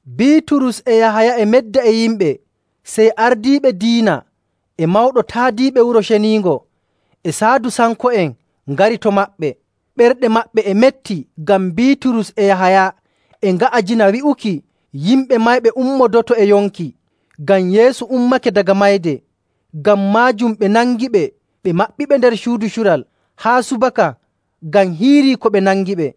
Biiturus e Yahaya e medda e yimɓe, sey ardiiɓe diina e mawɗo taadiiɓe Wuro Ceniingo e Saadusanko'en ngari to maɓɓe. Ɓerɗe maɓɓe e metti ngam Biiturus e Yahaya e nga'ajina wi'uki yimɓe mayɓe ummodoto e yonki, ngam Yeesu ummake daga mayde. Ngam maajum ɓe nangiɓe, ɓe maɓɓiɓe nder suudu cural haa subaka, ngam hiirii ko ɓe nangiɓe.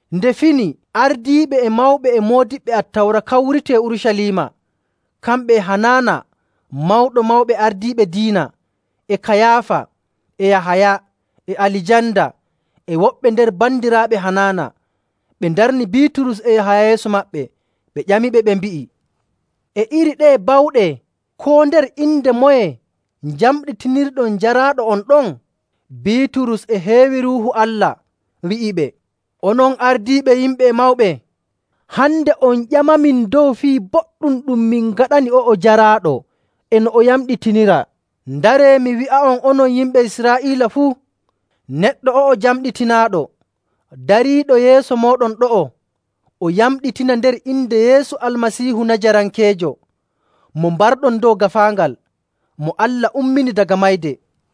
Nde fini, ardiiɓe e mawɓe e moodiɓɓe Attawra kawriti e Urucaliima, kamɓe e Hanaana Mawɗo Mawɓe Ardiiɓe Diina, e Kayaafa, e Yahaya, e Alijanda, e woɓɓe nder bandiraaɓe Hanaana. Ɓe ndarni Biiturus e Yahaya yeeso maɓɓe, ɓe ƴamiɓe ɓe mbi'i, “E iri ɗeye bawɗe, koo nder inde moye njamɗitinirɗon jaraaɗo on ɗon?” Biiturus e heewi Ruuhu Allah, wi'iɓe, “Onon ardiiɓe yimɓe e mawɓe, hande on ƴamamin dow fii boɗɗum ɗum min ngaɗani o'o jaraaɗo e no o yamɗitiniraa. Ndaree mi wi'a'on onon yimɓe Israa'iila fuu, neɗɗo o'o jamɗitinaaɗo, dariiɗo yeeso mooɗon ɗo'o, o yamɗitina nder inde Yeesu Almasiihu Najarankeejo mo mbarɗon dow gaafaangal, mo Allah ummini daga mayde.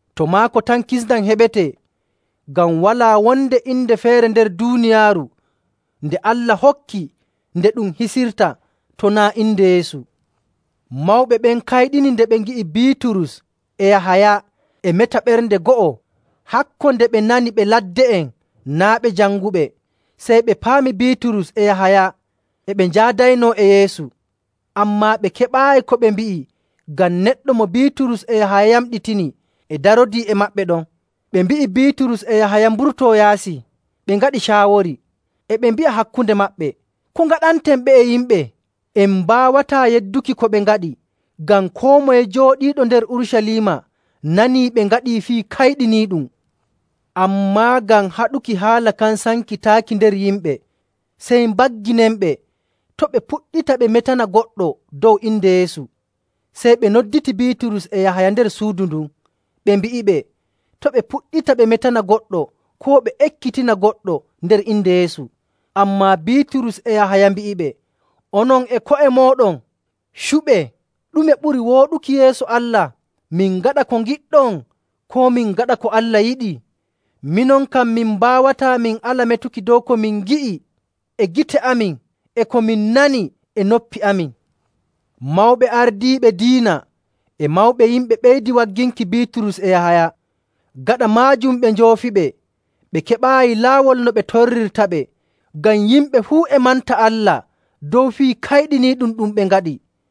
To maako tan kisndam heɓetee, ngam walaa wonde inde feere nder duuniyaaru nde Allah hokki nde ɗum hisirta to naa' inde Yeesu.” Mawɓe ɓen kayɗini nde ɓe ngi'i Biiturus e Yahaya e meta ɓernde go'o, hakko nde ɓe nani ɓe ladde'en, naa' ɓe janguɓe. Sey ɓe paami Biiturus e Yahaya e ɓe njaadaynoo e Yeesu. Ammaa ɓe keɓaayi ko ɓe mbi'i ngam neɗɗo mo Biiturus e Yahaya yamɗitini e darodii e maɓɓe ɗon. Ɓe mbi'i Biiturus e Yahaya mburtoo yaasi. Ɓe ngaɗi caawori. E ɓe mbi'a hakkunde maɓɓe, “Ko ngaɗanten ɓe'e yimɓe? En mbaawataa yedduki ko ɓe ngaɗi ngam koo moye jooɗiiɗo nder Urucaliima nanii ɓe ngaɗii fii kayɗiniiɗum. Ammaa ngam haɗuki haala kan sankitaaki nder yimɓe, sey mbagginenɓe to' ɓe puɗɗita ɓe metana goɗɗo dow inde Yeesu.” Sey ɓe nodditii Biiturus e Yahaya nder suudu ndun, ɓe mbi'iɓe to' ɓe puɗɗita ɓe metana goɗɗo koo ɓe ekkitina goɗɗo nder inde Yeesu. Ammaa Biiturus e Yahaya mbi'iɓe, “Onon e ko'e mooɗon, cuɓee ɗume ɓuri wooɗuki yeeso Allah, min ngaɗa ko ngiɗɗon koo min ngaɗa ko Allah yiɗi? Minon kam, min mbaawataa min ala metuki dow ko min ngi'i e gite amin e ko min nani e noppi amin.” Mawɓe ardiiɓe diina e mawɓe yimɓe ɓeydi wagginki Biiturus e Yahaya. Gaɗa maajum ɓe njoofiɓe, ɓe keɓaayi laawol no ɓe torrirtaɓe ngam yimɓe fuu e manta Allah dow fii kayɗiniiɗum ɗum ɓe ngaɗi.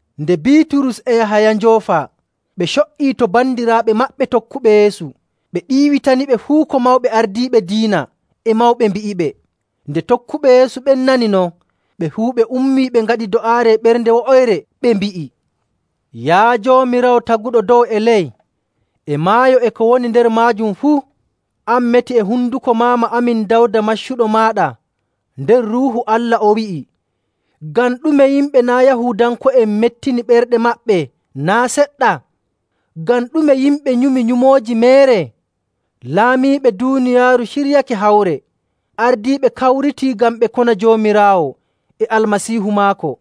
Nde Biiturus e Yahaya njoofaa ɓe co''ii to bandiraaɓe maɓɓe tokkuɓe Yeesu ɓe ɗiiwitaniɓe fuu ko mawɓe ardiiɓe diina e mawɓe mbi'iɓe. Nde tokkuɓe Yeesu ɓen nani non, ɓe fuu ɓe ummii ɓe ngaɗi do'aare e ɓernde wo'oyre, ɓe mbi'i, “Yaa Joomiraawo, taguɗo dow e ley e maayo e ko woni nder maajum fuu,. an meti e honduko maama amin Dawda maccuɗo maaɗa nder Ruuhu Allah o wi'i, ‘Ngam ɗume yimɓe naa' Yahuudanko'en mettini ɓerɗe maɓɓe naa' seɗɗa? Ngam ɗume yimɓe nyumi nyumooji meere? Laamiiɓe duuniyaaru ciryake hawre, ardiiɓe kawritii ngam ɓe kona Joomiraawo e Almasiihu maako.’.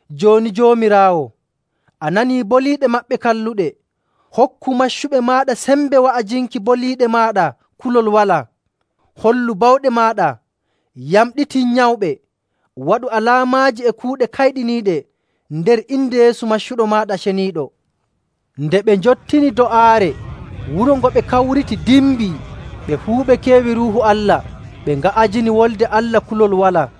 Jooni Joomiraawo, a nanii boliiɗe maɓɓe kalluɗe, hokku maccuɓe maaɗa sembe wa'ajinki boliiɗe maaɗa kulol walaa, hollu bawɗe maaɗa, yamɗitin nyawɓe, waɗu alaamaaji e kuuɗe kayɗiniiɗe nder inde Yeesu maccuɗo maaɗa ceniiɗo.” Nde ɓe njottini do'aare wuro ngo ɓe kawriti dimbii. Ɓe fuu ɓe keewi Ruuhu Allah, ɓe nga'ajini Wolde Allah kulol walaa.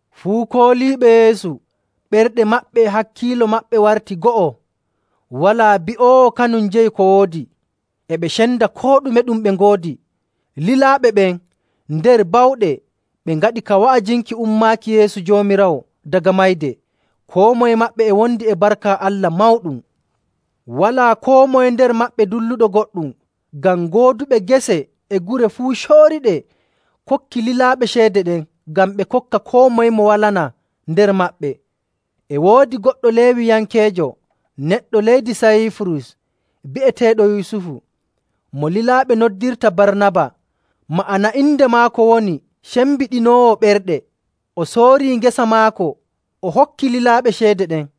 Fuu kooliiɓe Yeesu ɓerɗe maɓɓe e hakkiilo maɓɓe warti go'o. Walaa bi'oowo kanum jeyi ko woodi, e ɓe cenda koo ɗume ɗum ɓe ngoodi.. Lilaaɓe ɓen nder bawɗe ɓe ngaɗi ka wa'ajinki ummaaki Yeesu Joomiraawo daga mayde. Koo moye maɓɓe e wondi e barka Allah mawɗum. Walaa koo moye nder maɓɓe dulluɗo goɗɗum, ngam gooduɓe gese e gure fuu cooriiɗe kokkii lilaaɓe ceede ɗen ngam ɓe kokka koo moye mo walanaa nder maɓɓe. E woodi goɗɗo Leewiyankeejo, neɗɗo leydi Sayiifurus bi'eteeɗo Yusufu, mo lilaaɓe noddirta Barnaba (ma'ana inde maako woni cembiɗinoowo ɓerɗe), o soori ngesa maako, o hokki lilaaɓe ceede ɗen.